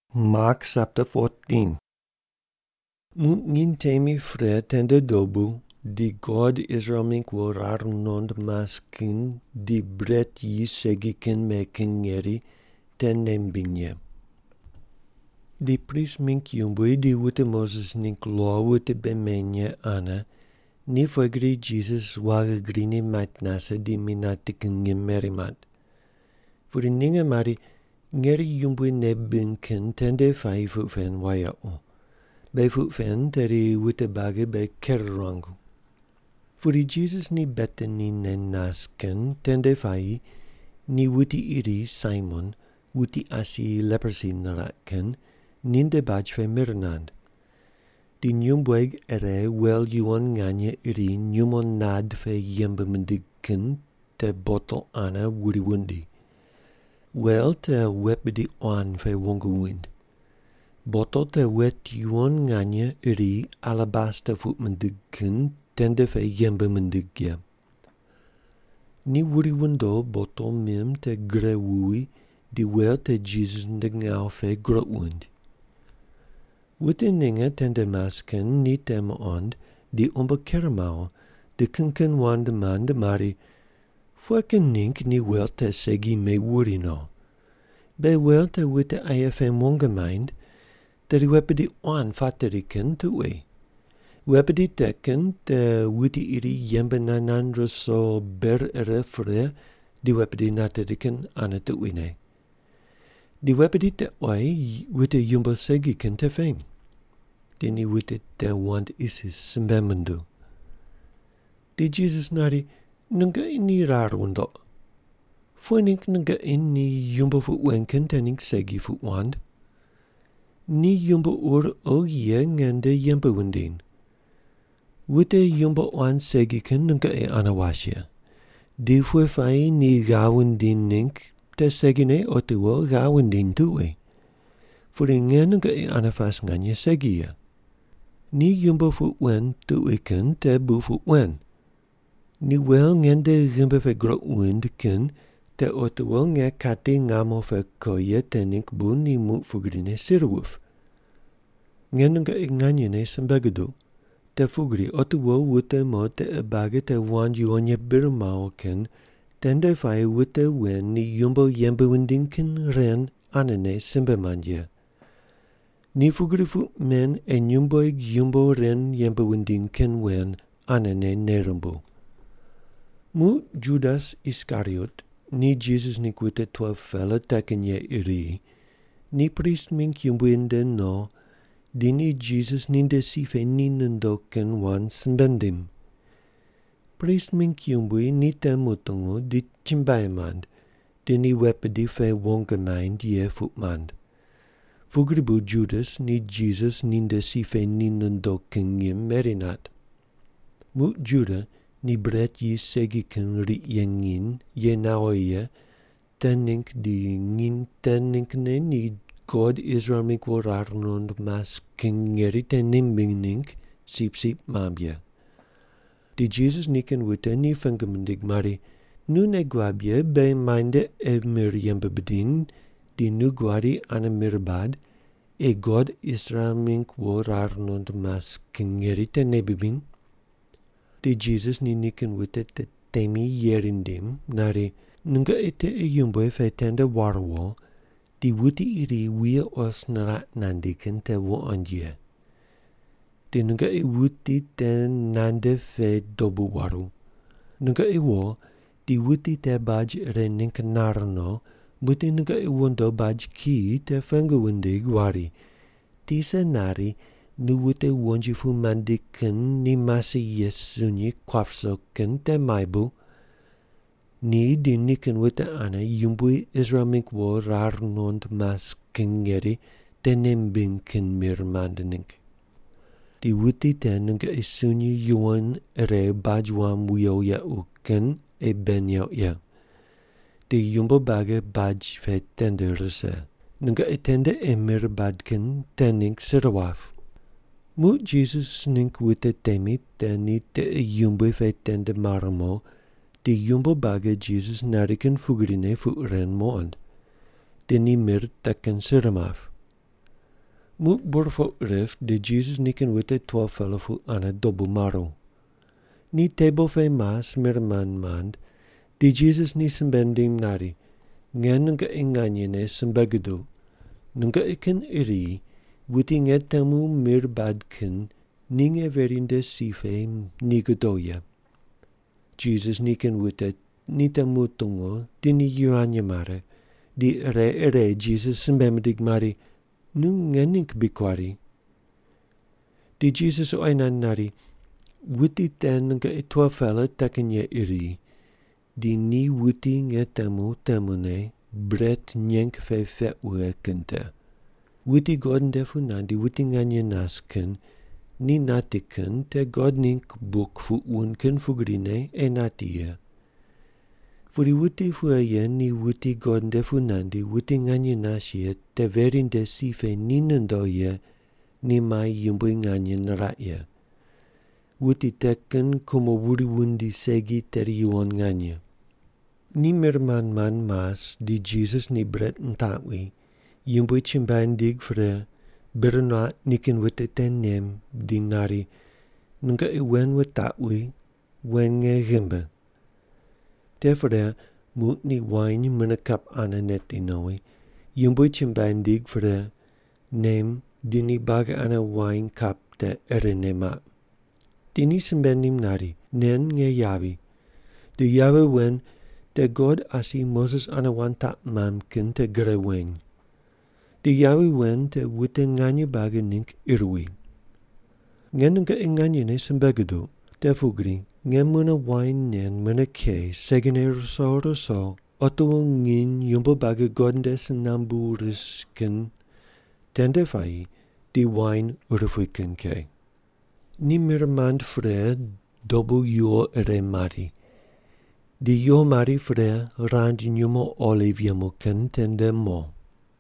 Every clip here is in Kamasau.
Muq nginy temine pre tende dobu di God Israel mingg wo rar nuqond mas kin di bret yis segi kin me kin ngeri te nei mimbiny ye. Di prist mingg yumbui di wute Moses ningg lo wute bei meny ye ane ni pughe gri Jisas waghi grine mait nase di mi nati kin ngim meri mat. Pudi ninge mari, “Ngeri yumbui nei bibiny kin tende puayi puq pen wayequ. Beghi puq pen tedi wute buagi beghi ker ruangu.” Pudi Jisas ni Betani ne nas kin tende puayi ni wuti iri Saimon, wuti asi leprosi niraq kin, ninde baj pe mir nand. Di nyumbueg ire wel yuwon nganye iri nyumo nad pe yembe mindig kin te botol ane wuri wundo. Wel te wet bidi quan pe wong wuind. Botol te wet yuwon nganye iri alabasta puq mindig kin tende pe yembe mindig ye. Ni wuri wundo botol mim te gure wuwi di wel te Jisas nde ngawu pe groq wuind. Wute ninge tende mas kin ni te muqond di umbo ker mawo di kin kin wand mand mari, “Pughe kin ningg ni wel te segi mewuri no? Beghi wel te wute aye pem wong maind, tedi wet bidi quan pateri kin tuqui. Wet bidi te kin te wuti iri yembe nand nand ruso ber ire pre ni wet bidi nateri kin ane tuquine. Di wet bidi te oyi wute yumbo segi kin te peny.” Di ni wute te wand isis simbe minduw. Di Jisas nari, “Nungoqi ni rar wundoq. Pughe ningg nungoqi ni yumbo puq wen kin te ningg segi puq wand? Ni yumbo ur oghi ye nge nde yembe wundiny. Wute yumbo quan segi kin nungoqi ane was ye, di pughe puayi ni ghav wundiny ningg te segine otiwo ghav wundiny tuqui. Pudi nge nungoqi ane pas nganye segi ye. Ni yumbo puq wen tuqui kin te bu puq wen. Ni wel ngende ghimbi pe groq wuind kin te otiwo nge kati ngamo pe ko ye te ningg bu ni muq pugrine sir wuip. Nge nungoqi nganyene simbe guduq te pugri otiwo wute mo tiqe buagi te wand yuwon ye bir mawo kin tende puayi wute wen ni yumbo yembe wundiny kin ren anene simbe mand ye. Ni pugri puq men ei nyumbueg yumbo ren yembe wundiny kin wen anene nei rumbuw.” Muq Judas Iskariot, ni Jisas ningg wute 12-pela te kin ye iri, ni prist mingg yumbui nde no di ni Jisas ninde si pe ni nondo kin wand simbe nindim. Prist mingg yumbui ni te mutungu di chumbuai mand di ni wet bidi pe wong maind ye puq mand. Pugri bu Judas ni Jisas ninde si pe ni nondo kin ngim meri nat. Muq Juda ni bret yis segi kin riq ye nginy ye nawo ye te ningg di nginy te ninggne ni God Israel mingg wo rar nuqond mas kin ngeri te nei mimbiny ningg sipsip mamb ye. Di Jisas nikin wute ni pengu mindig mari, “Nu nei guab ye beghi muainde ei mir yembe bidiny, di nu guadi ane mir bad ei God Israel mingg wo rar nuqond mas kin ngeri te nei bibiny?” Di Jisas ni nikin wute te temi yeri nindim nari, “Nungoqi tiqe yumbui pe tende war wo di wuti iri wuye os niraq nandi kin te wuqoind ye. Di nungoqi wuti te nande pe dobu waru. Nungoqi wo di wuti te baj ire ningg nar no muqdi nungoqi wondo baj kiyi te pengu wundig wari, ‘Tisa nari nu wute wonji pu mandi kin ni mase ye sunyi kuap ruso kin te muai bu? Ni di nikin wute ane Yumbui Israel mingg wo rar nuqond mas kin ngeri te nei mimbiny kin mir mand ningg.’ Di wuti te nungoqi sunyi yuwon ire baj wam wiyo yequ kin ei bei neuq ye, di yumbo buagi baj pe tende rise. Nungoqi tende ei mir bad kin te ningg sir wap.” Muq Jisas ningg wute temi te ni tiqe yumbui pe tende mar mo di yumbo buagi Jisas nari kin pugrine puq ren muqond. Di ni mir te kin sir map. Muq burpoq rip di Jisas nikin wute 12-pela pu ane dobu maru. Ni tebol pe mas mir mand mand di Jisas ni simbe nindim nari, “Nge nungoqi nganyene simbe guduq, nungoqi kin iri wuti nge temu mir bad kin ni nge veri nde si pe ni godo ye.” Jisas nikin wute ni te mutungu di ni yivany mare di ire ire Jisas simbe mindig mari, “Nu nge ningg bri kuari.” Di Jisas oyi nand nari, “Wuti te nungoqi 12-pela te kin ye iri, di ni wuti nge temu temune bret nyeng pe peq wughe kin te. Wuti God nde pu nandi wuti nganye nas kin ni nati kin te God ningg buk puq wund kin pugrine ei nati ye. Pudi wuti pughe ye ni wuti God nde pu nandi wuti nganye nas ye te veri nde si pe ni nondo ye ni mai yumbui nganye niraq ye. Wuti te kin kumo wuri wundi segi tedi yuwon nganye.” Ni mir mand mand mas, di Jisas ni bret nitaqwi, Yumbui chumbuai nindig pre, bir nuaq nikin wute te nem di nari, “Nungoqi wen wutaqwi, wen nge ghimbi.” Te pre muq ni wain mune kap ane neti nowi, Yumbui chumbuai nindig pre, nem di ni buagi ane wain kap te irene maq. Di ni simbe nindim nari, “Nen nge yavi di yavi wen te God asi Moses ane wand taq mamb kin te gre weny. Di yavi wen te wute nganye buagi ningg ir wi. Nge nungoqi nganyene simbe guduq, te pugri nge muq wain nen mune ke segine ruso ruso otiwo nginy yumbo buagi God nde si nambu rise kin tende puayi di wain urupui kin ke.” Ni mir mand pre dobu yuwo ire mari. Di yuwo mari pre, rand nyumo oliv yemu kin tende mo.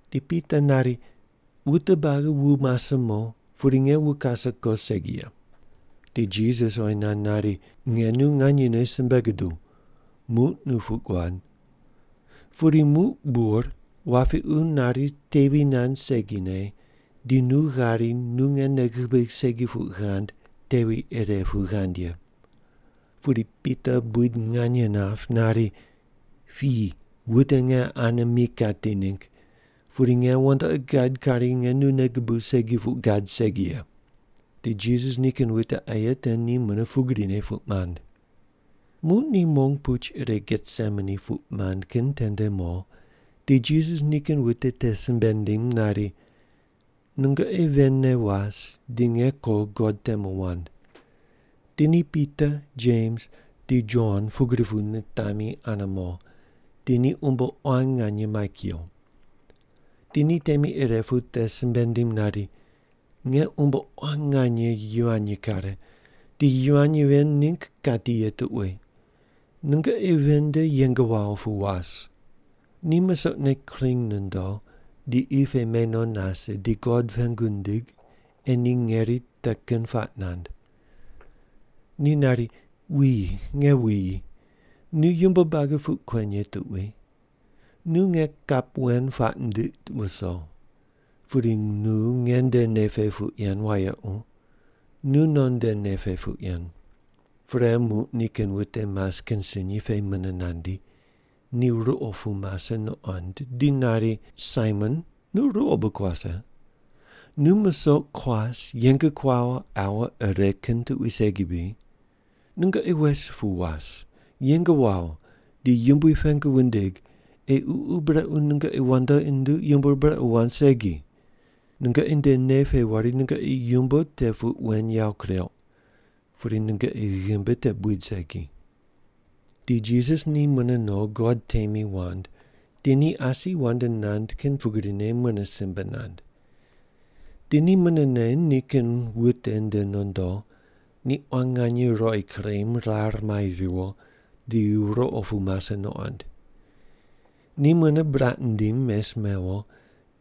Di Pita nari, “Wute buagi wu mase mo, pudi nge wu kase ko segi ye.” Di Jisas oyi nand nari, “Nge nu nganyene simbe guduw, muq nu puq guad. Pudi muq bur wapiqu nari tevi nand segine di nu ghari nu nge nei gubigh segi puq ghand tevi ire pu ghand ye.” Pudi Pita buid nganye nap nari, “Piyi wute nge ane mi kati ningg, pudi nge wandoqi gad kari nge nu nei gubuw segi puq gad segi ye.” Di Jisas nikin wute aye te ni mune pugrine puq mand. Muq ni mong puch ire Getsemani puq mand kin tende mo di Jisas nikin wute te simbe nindim nari, “Nungoqi ven ne was di nge ko God temu wand.” Di ni Pita, Jems di Jon pugri pu natemi ane mo, di ni umbo quan nganye mai kuyo. Di ni temi ire pu te simbe nindim nari, “Nge umbo pe quan nganye yivany kare di yivany ven ningg kati ye tuqui. Nungoqi ven nde yeng wawo pu was.” Ni musoqne kring nondo di qi pe me no nase di God pengu nindig ei ni ngeri te kin puaq nand. Ni nari, “Wuyi, nge wuyi, nu yumbo buagi puq kuen ye tuqui. Nu nge kap wen puaq ndiq wuso. Pudi nu nge nde nei pe puq yen wayequ, nunon nde nei pe puq yen.” Pre muq nikin wute mas kin sunyi pe mune nandi, ni ruqo pu mase nuqond di nari, “Saimon, nu ruqo bu kuase? Nu musoq kuas, yeng kuawo aua ire kin tuqui segi bri? Nungoqi wes pu was, yeng wawo, di Yumbui pengu wundig ei ququ brequ nungoqi wandoqi nunduq yumbo ur brequ wand segi. Nungoqi nde nei pe wari nungoqi yumbo te puq wen yawo kureuq, pudi nungoqi ghimbi te buid segi.” Di Jisas ni mune no God temi wand, di ni asi wand nand kin pugrine mune simbe nand. Di ni munene nikin wute nde nondo, ni quan nganye ruqoi kurem rar mai riwo di ruqo pu mase nuqond. Ni mune buraq nindim mes mewo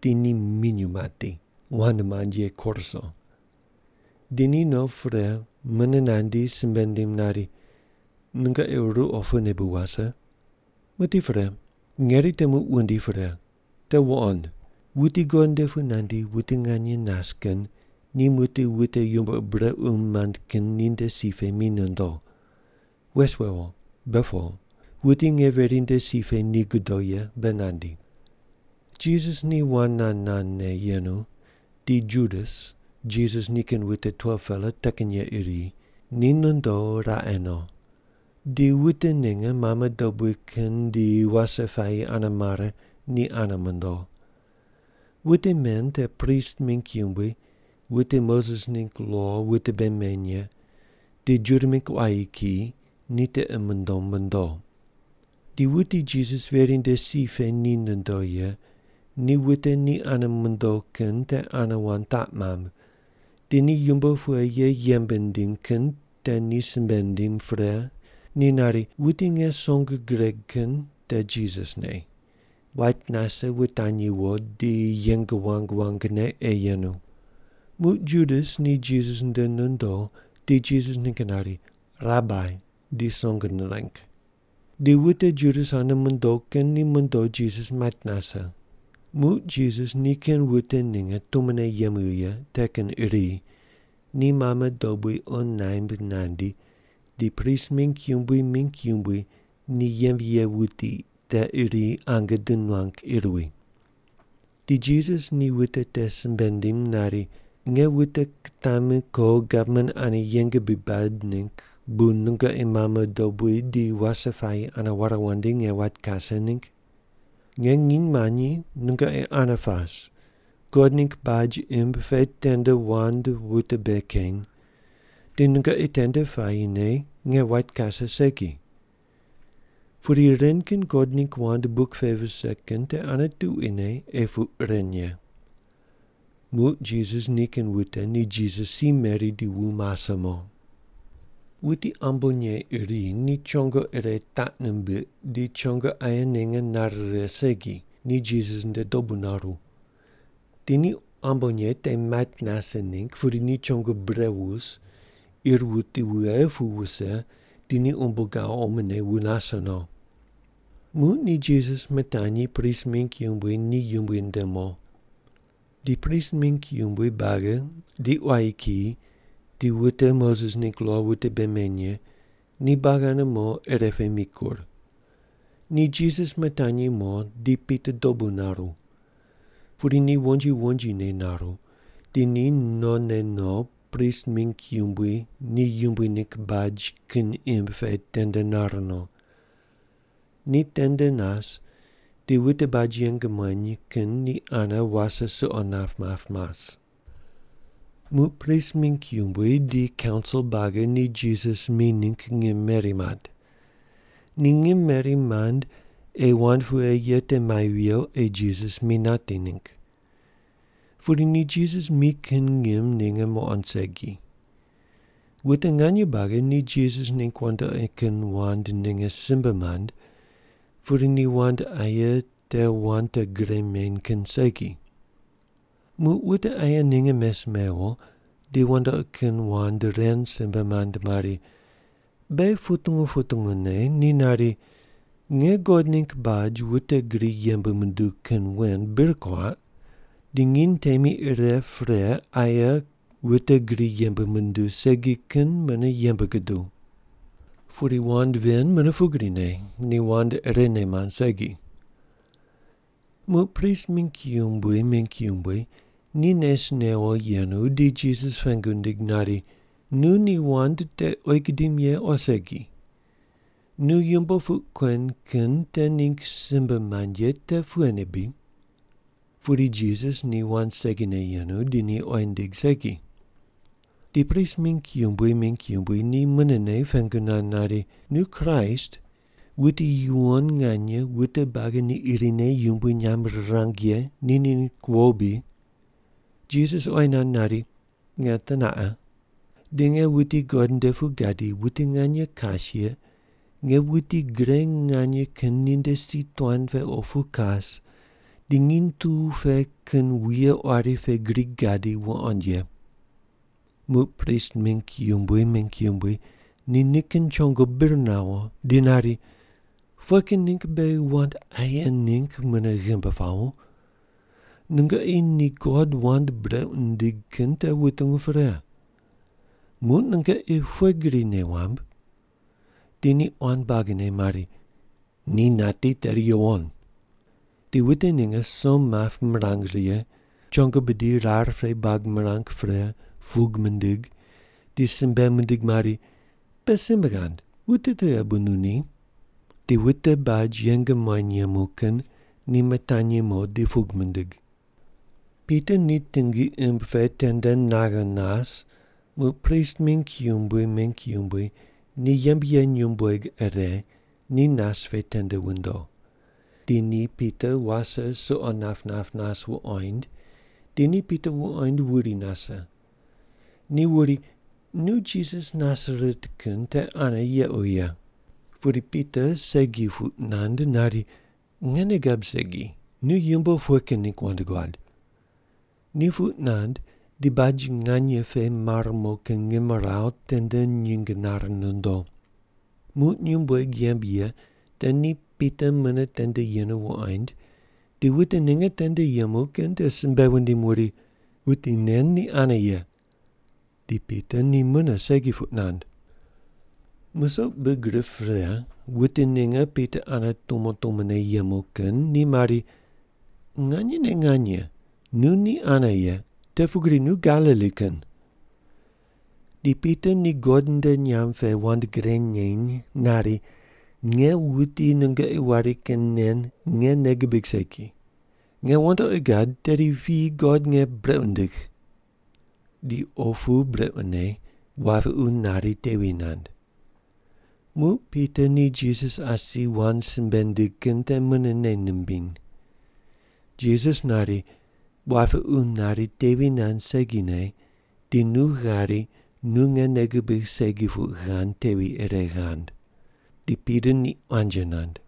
di ni minyuw mati, wand mand ye koruso. Di ni no pre mune nandi simbe nindim nari, “Nungoqi ruqo pune bu wase? Muqdi pre. Ngeri te muq wundi pre. Te wuqond. Wuti God nde pu nandi wuti nganye nas kin ni muqdi wute yumbo ur brequ mand kin ninde si pe mi nondo. Wes wewo. Be po. Wuti nge veri nde si pe ni godo ye be nandi.” Jisas ni wand nand nandne yenu di Judas, Jisas nikin wute 12-pela te kin ye iri, ni nondo raqe no. Di wute ninge mame dobui kin di wase puayi ane mare ni ane mondo. Wute men te prist mingg yumbui, wute Moses ningg lo wute bei meny ye di Juda mingg quayi kiyi ni tiqi mundom mondo. Di wuti Jisas veri nde si pe ni nondo ye ni wute ni ane mondo kin te ane wand taq mamb, di ni yumbo pughe ye yembe nindiny kin te ni simbe nindim pre, ni nari, “Wuti nge song gireg kin te Jisas ne. Wait nase wutanyi wo di yeng wang wangne ei yenu.” Muq Judas ni Jisas nde nondo di Jisas ningg nari, “Rabai” di song nireng. Di wute Judas ane mondo kin ni mondo Jisas mait nase. Muq Jisas nikin wute ninge tumone yemu ye te kin iri ni mame dobui qo naimb nandi di prist mingg yumbui mingg yumbui ni yembe ye wuti te iri ange di nuang ir wi. Di Jisas ni wute te simbe nindim nari, “Nge wute kitami ko gavman ane yeng bri bad ningg bu nungoqi mame dobui di wase puayi ane ware wandi nge wait kase ningg? Nge nginy manyi nungoqi ane pas, God ningg baj imb pe tende wand wute bei keny, di nungoqi tende puayine nge wait kase segi. Pudi ren kin God ningg wand buk pe vise kin te ane tuquine ei puq ren ye.” Muq Jisas nikin wute ni Jisas si meri di wu mase mo. Wuti ambonye iri ni chongo ire taq nimbiq di chongo aye ninge nare righe segi, ni Jisas nde dobu naru. Di ni ambonye te mait nase ningg pudi ni chongo bure wus, ir wuti wughe pu wuse di ni umbo gawo omone wu nase no. Muq ni Jisas mitanyi prist mingg yumbui ni yumbui nde mo. Di prist mingg yumbui buagi di quayi kiyi di wute Moses ningg lo wute bei meny ye ni buagi ane mo ire pe mikur. Ni Jisas mitanyi mo di Pita dobu naru. Pudi ni wonji wonjine naru, di ni none no prist mingg yumbui ni yumbui ningg baj kin imb pe tende nar no. Ni tende nas di wute baj yeng muany kin ni ane wase suqo map map mas. Muq prist mingg yumbui di kaunsil buagi ni Jisas mi ningg ngim meri mat. Ni ngim meri mand ei wand pughe ye te mai viyo ei Jisas mi nati ningg. Pudi ni Jisas mi kin ngim ninge muqond segi. Wute nganye buagi ni Jisas ningg wandoqi kin wand ninge simbe mand pudi ni wand aye ni wand te gre meny kin segi. Muq wute aye ninge mes mewo di wandoqi kin wand ren simbe mand mari, “Beghi putungu putungu ne ni nari, ‘Nge God ningg baj wute gri yembe munduw kin wen bir kuaq di nginy temi ire pre aye wute gri yembe munduw segi kin mune yembe guduw’.” Pudi wand ven mune pugrine, ni wand irene mand segi. Muq prist mingg yumbui mingg yumbui ni nes newo yenu di Jisas pengu nindig nari, “Nu ni wand te oyi gudim ye o segi? Nu yumbo puq kuen kin te ningg simbe mand ye te pughene bri?” Pudi Jisas ni wand segine yenu di ni oyi nindig segi. Di prist mingg yumbui mingg yumbui ni munene pengu nand nari, “Nu Kraist, wuti yuwon nganye wute buagi ni irine yumbui nyamb rirang ye ni ningg wo bri?” Jisas oyi nand nari, “Nge teneqa. Di nge wuti God nde pu gadi wuti nganye kas ye nge wuti gre nganye kin ninde si tuan pe opu kas di nginy tu pe kin wuye quari pe gri gadi wuqoind ye.” Muq prist mingg yumbui mingg yumbui ni nikin chongo bir nawo di nari, “Pughe kin ningg beghi wand aye ningg mune ghimbi pawo? Nungoqi ni God wand brequ nindig kin te wutungu pre. Muq nungoqi pughe gri nei wamb?” Di ni quan buagine mari, “Ni nati tedi yuwon.” Di wute ninge som map mirang righe, chongo bidi pe rar buag mirang pre pug mindig di simbe mindig mari, “Be simbe ghand, wuti tughe bu nu ni?” Di wute baj yeng muany yemu kin ni mitanyi mo di pug mindig. Pita ni tingi imb pe tende naghe nas muq prist mingg yumbui mingg yumbui ni yembe ye nyumbueg ire ni nas pe tende wundo. Di ni Pita wase suqo nap nap nas wuqoind di ni Pita wuqoind wuri wuse. Di wuri, “Nu Jisas Nasaret kin te ane yequ ye.” Pudi Pita segi puq nand nari, “Nge nei gab segi. Nu yumbo pughe kin ningg wand guad?” Ni puq nand di baj nganye pe mar mo kin ngimrawu tende nyinge nare nondo. Muq nyumbueg yembe ye te ni Pita mune tende yenu wuqoind di wute ninge tende yemu kin te simbe wundim wuri, “Wuti nen ni ane ye.” Di Pita ni mune segi puq nand. Musoq big rip pre wute ninge Pita ane tumo tumone yemu kin ni mari, “Nganyene nganye nu ni ane ye, te pugri nu Galili kin.” Di Pita ni God nde nyamb pe wand gre neny nari, “Nge wuti nungoqi wari kin nen nge nei gibig segi. Nge wandoqi gad tedi piyi God nge brequ nindigh.” Di opu brequne wapiqu nari tevi nand. Muq Pita ni Jisas asi wand simbe nindig kin te mune nei nimbiny. Jisas nari, “Wapiqu nari tevi nand segine di nu ghari nu nge nei gubigh segi puq ghand tevi ire ghand.” Di Pita ni quanji nand.